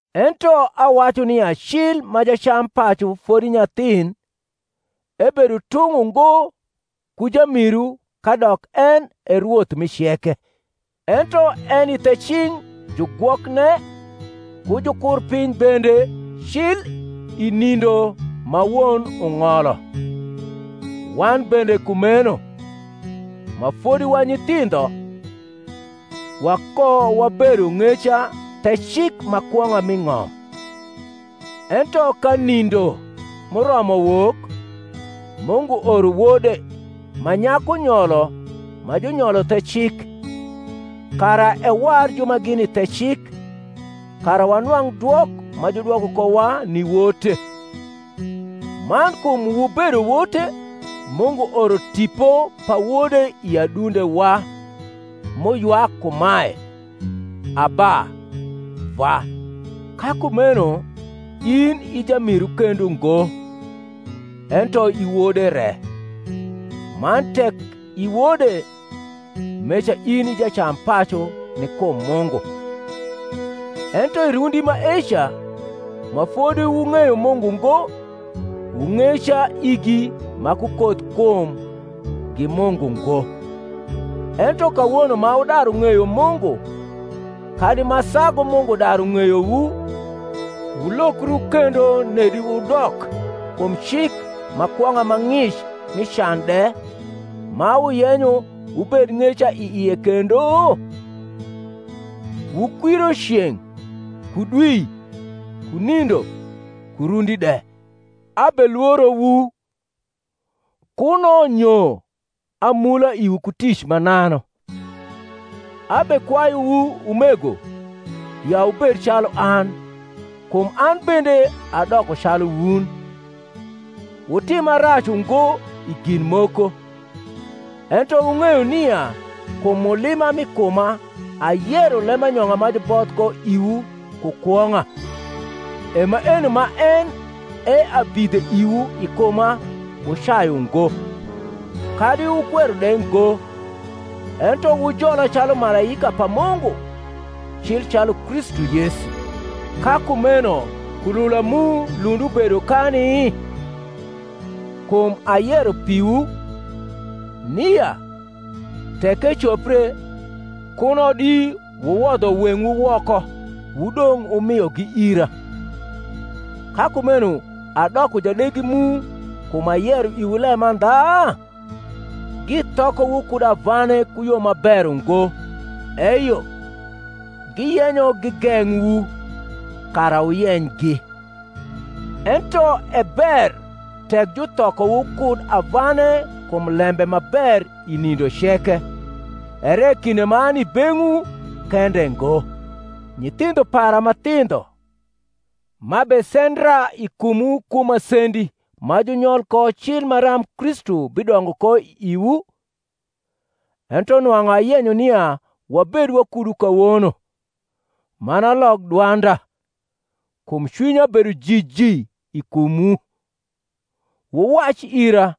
Ento awacu nia cil ma jacampacu fodi nyathin, ebedo tung’ ungo ku jamiru kadok en e rwoth mi ceke; ento eni the cing’ jugwokne ku jukurpiny bende cil i nindo ma won ung’olo. Wan bende kumeno, ma fodi wa nyithindho, wakowabedo ng’eca the cik ma kwong’a mi ng’om: ento ka nindo m’uromo wok, Mungu oro Wode, ma nyaku nyolo, ma junyolo the cik, kara ewar ju ma gini the cik, kara wanwang’ dwok ma judwoko kowa ni wote. Man kum wubedo wote, Mungu oro Tipo pa Wode i adundewa, m’uywak kumae, Abba, Vwa. Ka kumeno in i jamiru kendo ngo, ento i wode re: man tek i wode, meca in i jacampacu ni kum Mungu. Ento i rundi maeca, ma fodi wung’eyo Mungu ngo, wu ng’eca igi ma ku koth kum gi mungu ngo; ento kawono ma wudaru ng’eyo Mungu kadi ma sagu Mungu daru ng’eyowu, wulokru kendo nedi wudok kum cik ma kwong’a ma ng’ic mi can de, ma wuyenyo wubed ng’eca i ie kendo? Wukwiro ceng’, ku dwi, ku nindo, ku rundi de. Abelworowu, kuno nyo amula iwu ku tic mananu. Abekwayuwu, umego, ya wubed calu an, kum an bende adoko calu wun. Wutima rac ungo i gin moko: ento wung’eyo nia kum mulima m’i kuma ayero lembanyong’a ma juboth ko iwu ku kwong’a: e maeno ma en e abidhe iwu i kuma wucayu ngo, kadi wukwero de ngo; ento wujola calu malaika pa Mungu, cil calu Kristu Yesu. Ka kumeno kulula mu lund ubedo kani? kum ayero piwu, nia, tek ecopre, kuno di wuwodho weng’wu woko wudong’ wumiogi ira. Ka kumeno adoko jadegi mu kum ayero iwu lemandha? Githokowu kud avane ku yo ma ber ungo; eyo, giyenyo gigeng’wu, kara wuyenygi. Ento e ber tek juthokowu kud avane kum lembe ma ber i nindo ceke, ere kinde m’ani i beng’wu kende ngo. Nyithindho para ma thindho, m’abesendra i kumwu ku masendi ma junyol ko cil maram Kristu bidongo ko i iwu, ento nwang’u ayenyo nia wabed wakudu kawono, man alok dwanda; kum cwinya bedo jiji i kumwu. Wuwac ira,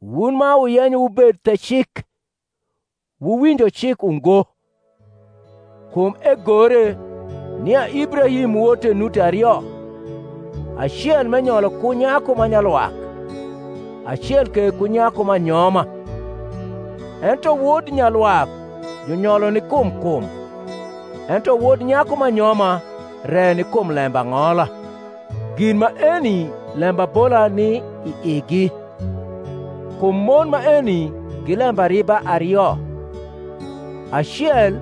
wun ma wuyenyo wubed the cik, wuwinjo cik ungo: Kum egore, nia Ibrahim wote nuti ario, acel m’cnyolo ku nyaku ma nyalwak, acel ke ku nyaku m’anyoma. Ento wod nyalwak junyolo ni kum kum; ento wod nyaku m’anyoma re ni kum lembang’ola. Gin maeni lembabola ni i igi: kum mon maeni gi lembariba ario; acel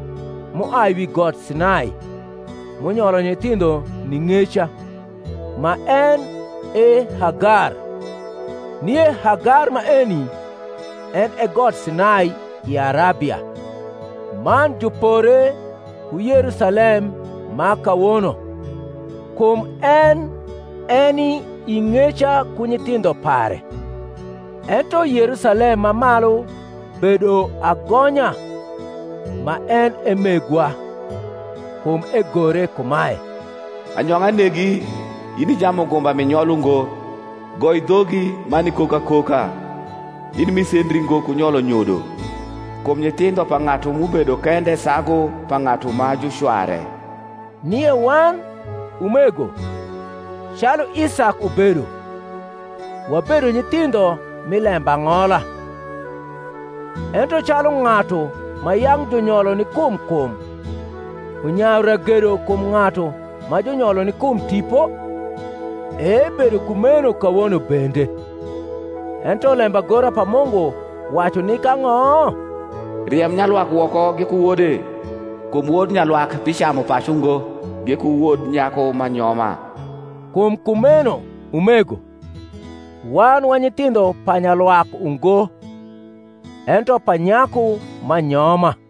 m’uai wi got Sinai, m’unyolo nyithindho ni ng’eca, ma en e Hagar. Nie Hagar maeni en e got Sinai i Arabia, man jupore ku Yerusalem ma kawono: kum en eni i ng’eca ku nyithindho pare. Ento Yerusalem ma malu bedo agonya, ma en e megwa. Kum egore kumae, Anyong’a negi, in i jamugumba m’i nyol ungo; Goi dhogi man ikok akoka, in m’ise ndri ngo ku nyolo nyodo: Kum nyithindho pa ng’atu m’ubedo kende sagu pa ng’atu ma ju cware. Nie wan, umego, calu Isak ubedo, wabedo nyithindho mi lembang’ola. Ento calu ng’atu ma yang’ junyolo ni kum kum unyayu ragedo kum ng’atu ma junyolo ni kum Tipo, e ebedo kumeno kawono bende. Ento lembagora pa Mungu wacu nik ang’o? Riem nyalwak woko giku wode: kum wod nyalwak bicamu pacu ngo giku wod nyaku m’anyoma. Kum kumeno, umego, wan wa nyithindho pa nyalwak ungo, ento pa nyaku m’anyoma.